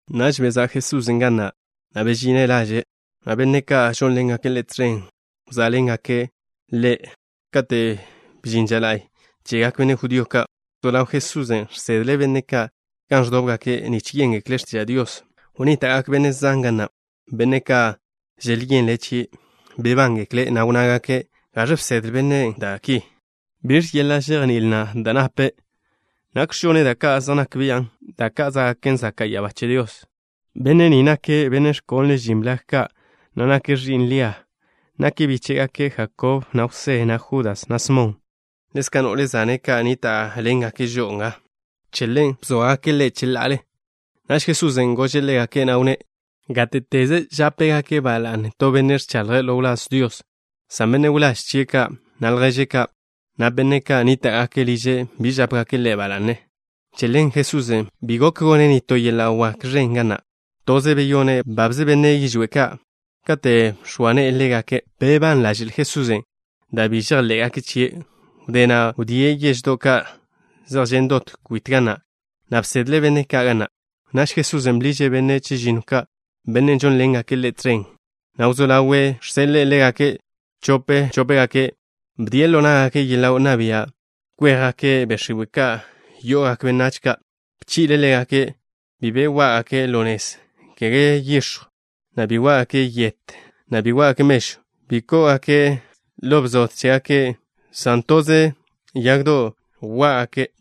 Naž bezá' Jesusen' ga na', na' bežine' laže', na' benne' ka' žónḻengake' Ḻe' tẕen wzá'ḻengake' Ḻe' tẕen. Kate' bžin ža la'y chegak benne' judío ka', wzó ḻaw Jesusen' žsedle' benne' ka' gan ẕdóbgake' nich yéngekle' x̱tiža' Dios. Wnníta'gak benne' zan ga na', benne' ka' želyenle' chie'. Bebángekle', na' wnnágake': —¿Gaẕ bsedle bennen' da' ki? ¿Biẕ yeḻa' žejní'il na' da' nape'? ¿Nakx̱ žone' da' ka' zej nak bian', da' ka' zá'gaken zaka' ya'abá che Dios? Benne' ni nake' benne' ẕkonle' žin blag ka', ẕi'n Lia. Nake' bíche'gak Jakob, na' Jwsé, na' Judas, na' Smon. Ḻezka' no'le zane' ka' nníta'ḻengake' žo'o nga. Che ḻen bzóagake' Ḻe' cheḻa'ale. Naž Jesusen' gože' ḻégake', na' wnné': —Gáte'teze žápegake' ba la'ne to benne' ẕchaḻje' ḻo wláz Dios, san benne' wláž chie' ka', na' lježe' ka', na' benne' ka' nníta'gake' liže' bi žápegake' ḻe' ba la'ne. Che ḻen Jesusen' bi gok gone' nitó yeḻa' wak ẕen ga na'. Toze beyone' babze benne' yižwé' ka', kate' bx̱oa ne'e ḻégake'. Bebán ḻaže'l Jesusen' dan' bi žejḻé'gake' chie'. Wdé na' wdíe' yeždo' ka' zej žen' dot kwit ga na', na' bsedle' benne' ka' ga na'. Naž Jesusen' bḻiže' benne' chežinno ka', benne' žónḻengake' Ḻe' tẕen, na' wzó ḻawe' žseḻe'e ḻégake' chope chópegake'. Bdie' ḻo ná'gake' yeḻa' wnná bia' kwéjgake' be' x̱iwe' ka' yo'ogak benách ka'. Bchi'le' ḻégake' bi be wá'gake' ḻo nez, kege yix̱jw, na' kege yet, na' kege mežw bi kó'ogake' ḻo bzode chégake', san toze yagdo' chjwá'gake'.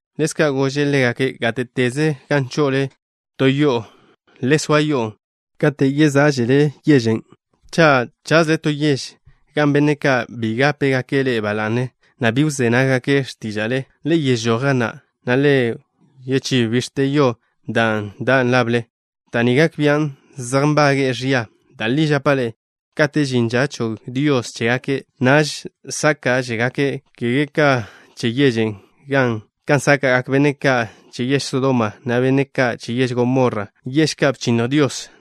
Ḻezka' gože' ḻégake': —Gáte'teze gan cho'ole to yo'o, le soa yo'on' kate' yezá'žele yežen'. Cha' chazle to yež gan benne' ka' bi gápegake' ḻe'e ba la'ne, na' bi wzé nággake' x̱tíža'le, le yežój ga na', na' le wchínnj bix̱te yo da' dan' lable. Da' ni gak bian' zej nbage'e ẕia. Da' li žapa' ḻe'e, kate' žin ža chog Dios chegak benách ka', naž sáka'žegak benne' ka' che yežen' ka sáka'gak benne' ka' che yež Sodoma, na' benne' ka' che yež Gomorra, yež ka' bchinnj Dios.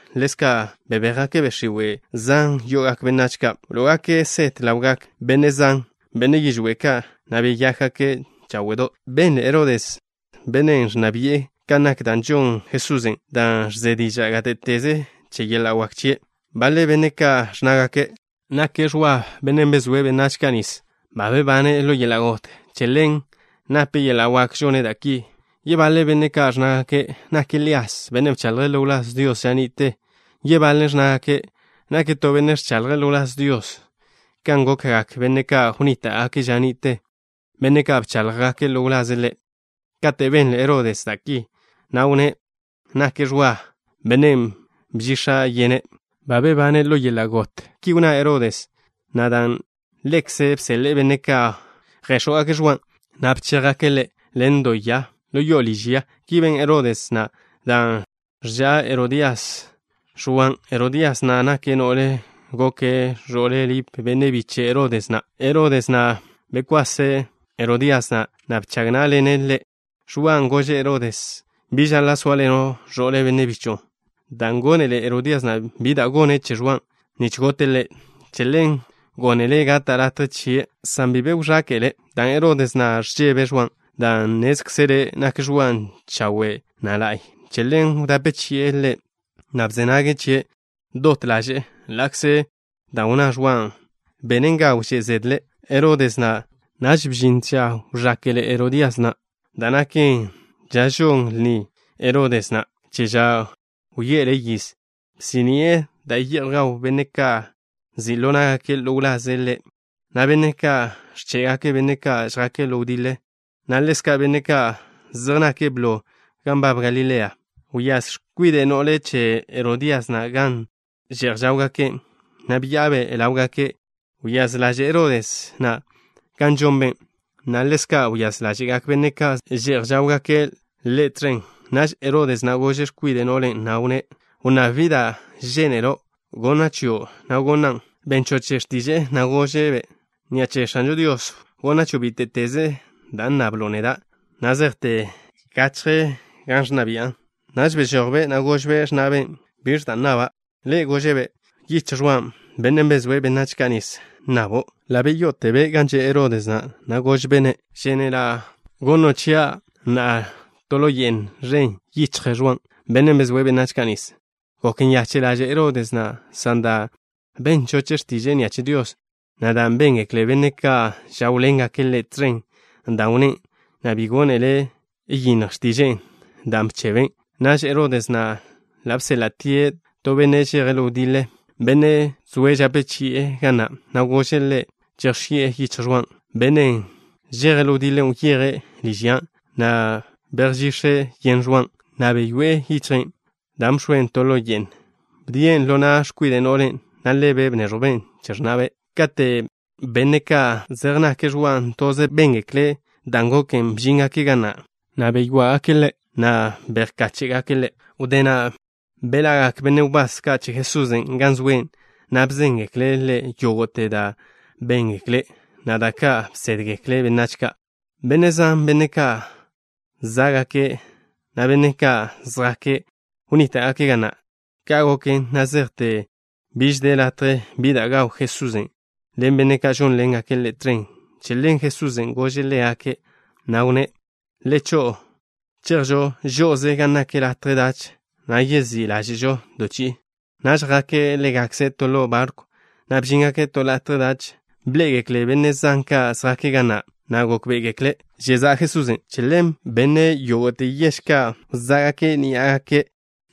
Ḻezka' bebéjgake' be' x̱iwe' zan yo'ogak benách ka'. Wló'ogake' set ḻawgak benne' zan, benne' yižwé' ka', na' beyákgake' cháwe'do'. Benle Herodes, benne' ẕnna bi'e, kan nak da' žon Jesusen', dan' ẕze diža' gáte'teze che yeḻa' wak chie'. Baḻe benne' ka' ẕnnágake': —Nake' Ẕwa, bennen' bezóe' benách ka' nis. Ba bebane' ḻo yeḻa' got. Che ḻen nape' yeḻa' wak žone' da' ki. Yebaḻe benne' ka' ẕnnágake': —Nake' Lías, bennen' bchaḻje' ḻo wláz Dios ža ni'te. Yebaḻe' ẕnnágake': —Nake' to benne' ẕchaḻje' ḻo wláz Dios kan gokgak benne' ka' wnníta'gake' ža ni'te, benne' ka' bcháḻjgake' ḻo wlaze' Ḻe'. Kate' benle Herodes da' ki, wnné': —Nake' Ẕwa, bennen' bžix̱a' yene'. Ba bebane' ḻo yeḻa' got. Ki wnná Herodes na' dan' ḻekze' bseḻe'e benne' ka' yjéx̱jwgake' Ẕwan', na' bchéjgake' ḻe' ḻen do ya ḻo yo'o liž ya. Ki ben Herodes na' dan' ẕža' Herodías Ẕwan'. Herodías na' nake' no'len' goke' ẕo'le Lip, benne' biche' Herodes na'. Herodes na' bekwase' Herodías na', na' bchag ná'ḻene' ḻe'. Ẕwan' gože' Herodes na': —Bi žaḻa' sóaḻeno' ẕo'le benne' bicho'o. Dan' gónele Herodías na' bi da' gone' che Ẕwan' nich gote' ḻe', che ḻen gónele' gata' latje chie', san bi be wẕáka'le', dan' Herodes na' ẕžebe' Ẕwan', dan' nnézkzele' nak Ẕwan' chawe', na' la'y. Che ḻen wdape chi'e ḻe', na' bze nage' chie' dot ḻaže'e ḻa'kze dan' wnná Ẕwan' benen ga wžé' zedle Herodes na'. Naž bžin to ža wẕáka'le Herodías na', da' naken ža žon lni Herodes na' che ža wye'ele' yiz. Bsí'ni'e da' ye'j gawgak benne' ka' nzi' ḻo ná'gake' ḻo wlaze' ḻe', na' benne' ka' ẕché'gake' benne' ka' žjake' ḻo wdiḻe, na' ḻezka' benne' ka' zej nake' blo gan nbab Galilea. Wyáz x̱kwide' no'le che Herodías na' gan že'j žáwgake', na' bya'abe' ḻáwgake'. Wyáz ḻaže' Herodes na' kan žonbe', na' ḻezka' wyáz ḻáže'gak benne' ka' že'j žáwḻengake' ḻe' tẕen. Naž Herodes na' gože' x̱kwide' no'len', na' wnné': —Wnnáb bi da' žénelo' wneẕjwa' chio', na' gonan'. Ben choche' x̱tiže'e, na' gože'-be': —Ni'a che X̱anžo Dios wneẕjwa' chio' bíte'teze da' nnablo' neda', na' zejte gachje gan ẕnna bi'a. Naž bežojbe', na' gožbe' x̱na'be': —¿Biẕ nnaba'? Ḻe' gože'-be': —Yichj Ẕwa, bennen' bezóe' benách ka' nis, nnabo'. Ḻa' beyáztebe' gan zoa Herodes na', na' gožbe'-ne': —Žénela' wx̱ó' chia' na'a ḻo ye'n ẕen yichj Ẕwa, bennen' bezóe' benách ka' nis. Gok nyache' ḻaže' Herodes na', san dan' ben choche' x̱tiže'e ni'a che Dios, na' dan' béngekle benne' ka' žáwḻengake' ḻe' tẕen dan' wnné', na' bi gónele' yinnj x̱tiže'e da' bchebe ḻaže'e chebe'. Naž Herodes na' ḻa' bséḻa'tie' to benne' žeje' ḻo wdiḻe, benne' zoe' žape chi'e ga na', na' gože' ḻe' chejx̱i'e yichj Ẕwan'. Bennen' žeje' ḻo wdiḻe wyeje' liž ya, na' bejžix̱e' yen Ẕwan', na' bechi'e yichje', dan' bx̱oe' to ḻo ye'n ẕen. Wdíen' ḻo na' x̱kwide' no'len', na' ḻebe' bnéẕjwben' che x̱na'be'. Kate' benne' ka' zej nake' Ẕwan' toze béngekle' dan' goken, bžíngake' ga na', na' beché'gake' ḻe', na' bejkáche'gake' ḻe'. Wdé na' beḻa'gak benne' wbás ka' che Jesusen' gan zoe', na' bzéngekle' Ḻe' yógo'te da' béngake', na' da' ka' bsédgekle' benách ka'. Benne' zan, benne' ka' zá'gake', na' benne' ka' zjake', wnníta'gake' ga na'. Ka' goken na' zejte biž de latje bi da' gaw Jesusen' ḻen benne' ka' žónḻengake' Ḻe' tẕen. Che ḻen Jesusen' gože' ḻégake', na' wnné': —Le cho'o. Chejžo žo'oze gan nak latje dach, na' yezí' ḻáže'žo to chi'i. Naž jake' ḻégakze' to ḻo barkw, na' bžíngake' to latje dach. Bḻé'egekle benne' zan ka' zjake' ga na', na' gókbe'egekle' žezá'a Jesusen'. Che ḻen benne' yógo'te yež ka' wzá' ní'agake',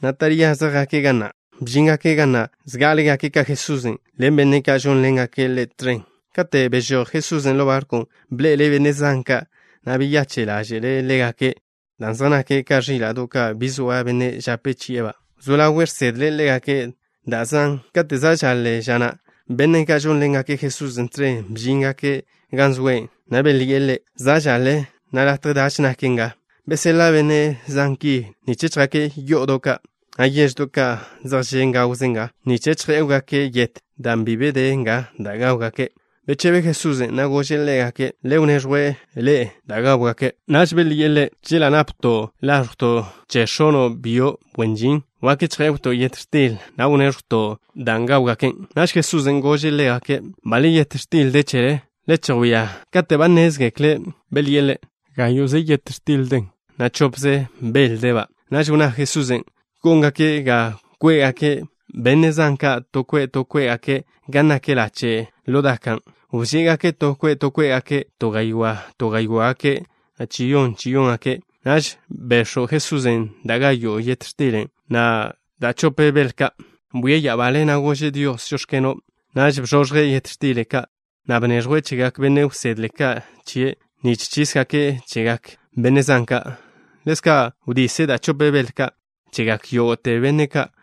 na' taríaze jake' ga na'. Bžíngake' ga na' zgá'alegake' ka Jesusen' ḻen benne' ka' žónḻengake' Ḻe' tẕen. Kate' bežój Jesusen' ḻo barkwn', bḻe'ele' benne' zan ka', na' beyache' ḻáže'le' ḻégake' dan' zej nake' ka ẕíla'do' ka' bi zoa benne' žape chi'e ḻégakba'. Wzó ḻawe' žsedle' ḻégake' da' zan. Kate' za' žaḻe ža na', benne' ka' žónḻengake' Jesusen' tẕen bžíngake' gan zoe', na' belyi'e Ḻe': —Za' žaḻe, na' latje dach naken nga. Beseḻa' benne' zan ki, nich chjake' yo'odo' ka', na' yeždo' ka' zej žen' gawze nga, nich chjé'wgake' yet, dan' bi be de nga da' gáwgake'. Bechebe Jesusen', na' gože' ḻégake': —Le wneẕjw ḻe'ekze da' gáwgake'. Naž belyi'e Ḻe': —Chela' napto' láẕjwto' che x̱ono' byo' wen žin, wak chjé'wto' yet x̱til, na' wnéẕjwto' dan' gáwgake'. Naž Jesusen' gože' ḻégake': —¿Baḻ yet x̱til de chele? Le chejwía. Kate' ba nnézgekle', belyi'e Ḻe': —Gáyo'ze yet x̱til den, na' chopze bel deba'. Naž wnná Jesusen' góngake' ga kwe'gak benne' zan ka' to kwe' to kwé'gake' gan nak lache' ḻo daka'. Wžé'gake' to kwe' to kwé'gake', to gaywá' to gaywá'gake', na' chiyón chiyóngake'. Naž bex̱w Jesusen' da' gáyo'te yet x̱til ka', na' da' chope bel ka'. Bwie' ya'abale, na' gože' Dios: “Žóx̱keno'.” Naž bzoẕje' yet x̱til ka', na' bneẕjwen' chegak benne' wsedle chie' ka' nich chísgaken' chegak benne' zan ka'. Ḻezka' wdise' da' chope bel ka' chegak yógo'te benne' ka'.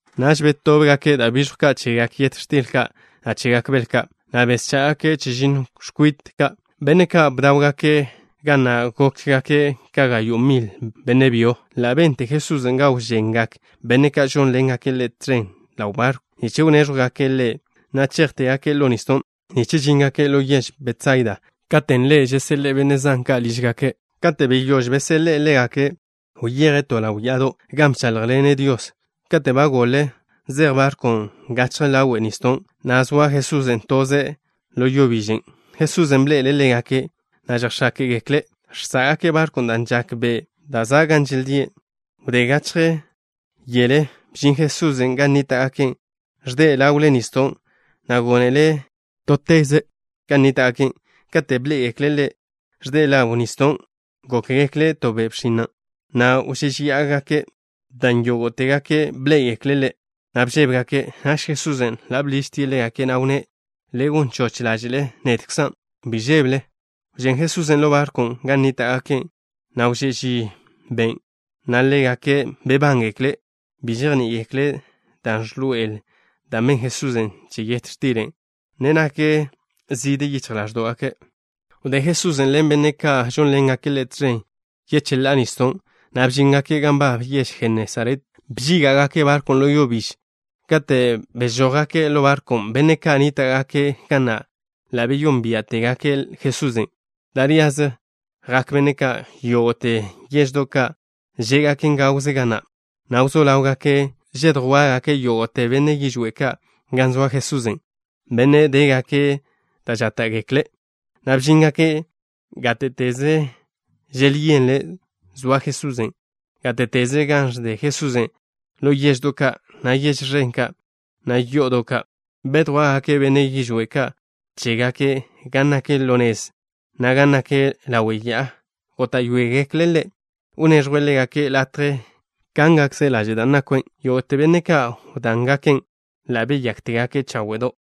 Naž betóbgake' da' bižjw ka' chegak yet x̱til ka', na' chegak bel ka', na' beschá'gake' chežinno x̱kwite ka'. Benne' ka' bdáwgake' ga na' gókgake' ka gayo' mil benne' byo ka'. Ḻa' bente Jesusen' ga wžengak benne' ka' žónḻengake' Ḻe' tẕen ḻaw barkw, nich wnéžwgake' Ḻe', na' chejtégake' ḻo nisdon', nich žíngake' ḻo yež Betsaida, katen' Ḻe' yeseḻe'e benne' zan ka' lížgake'. Kate' beyóž beseḻe'e ḻégake', wyeje' to ḻaw ya'ado', gan bcháḻjḻene' Dios. Katen' ba goḻen, zej barkwn' gachje ḻáwe'le nisdon', na' zoa Jesusen' toze' ḻo yo bižen'. Jesusen' bḻe'ele' ḻégake', na' žejx̱áke'gekle' žsá'gake' barkwn' dan' žak be' da' za' gan želdíe'. Wdé gachje yele bžin Jesusen' gan nníta'gake', ẕde' ḻáwe'le nisdon', na' gónele' teze' gan nníta'gake'. Kate' bḻé'egekle' Ḻe' ẕde' ḻáwe'le nisdon', gókgekle' to bxin nake', na' wžéžeya'agake', dan' yógo'tegake' bḻé'egekle' Ḻe', na' bžébegake'. Naž Jesusen' ḻa' bḻižtie' ḻégake', na' wnné': —Le gon choch ḻáže'le. Nedkzan'. Bi žébele. Wžén Jesusen' ḻo barkwn' gan nníta'gake', na' wžé' ži ben' žaken, na' ḻégake' bebánḻe'egekle'. Bi žejní'igekle' da' ẕḻoe'el dan' ben Jesusen' che yet xtilen'. Ne nak zide yichj ḻáẕdo'gake'. Wdé Jesusen' ḻen benne' ka' žónḻengake' Ḻe' tẕen yecheḻá'a nisdo', na' bžíngake' gan nbab yež Jenesaret. Bžíga'gake' barkwn' ḻo yo bižen'. Kate' bežójgake' ḻo barkwn', benne' ka' nníta'gake' ga na' ḻa' beyónbia'tegake' Jesusen'. Taríaze jak benne' ka' yógo'te yeždo' ka' žé'gaken gawze ga na', na' wzó ḻáwgake' žedjwá'gake' yógo'te benne' yižwé' ka' gan zoa Jesusen', benne' dégake' da' žáta'gekle', na' bžíngake' gáte'teze želyenle' zoa Jesusen'. Gáte'teze gan ẕde Jesusen', ḻo yeždo' ka', na' yež ẕen ka', na' yo'odo' ka', bedjwá'gake' benne' yižwé' ka' chégake' gan nak ḻo nez, na' gan nak ḻawe' ya'a. Góta'yoegekle' Ḻe' wneẕjwe' ḻégake' latje kángakze' laže' da' nakwe'. Yógo'te benne' ka' wdángaken' ḻa' beyáktegake' cháwe'do'.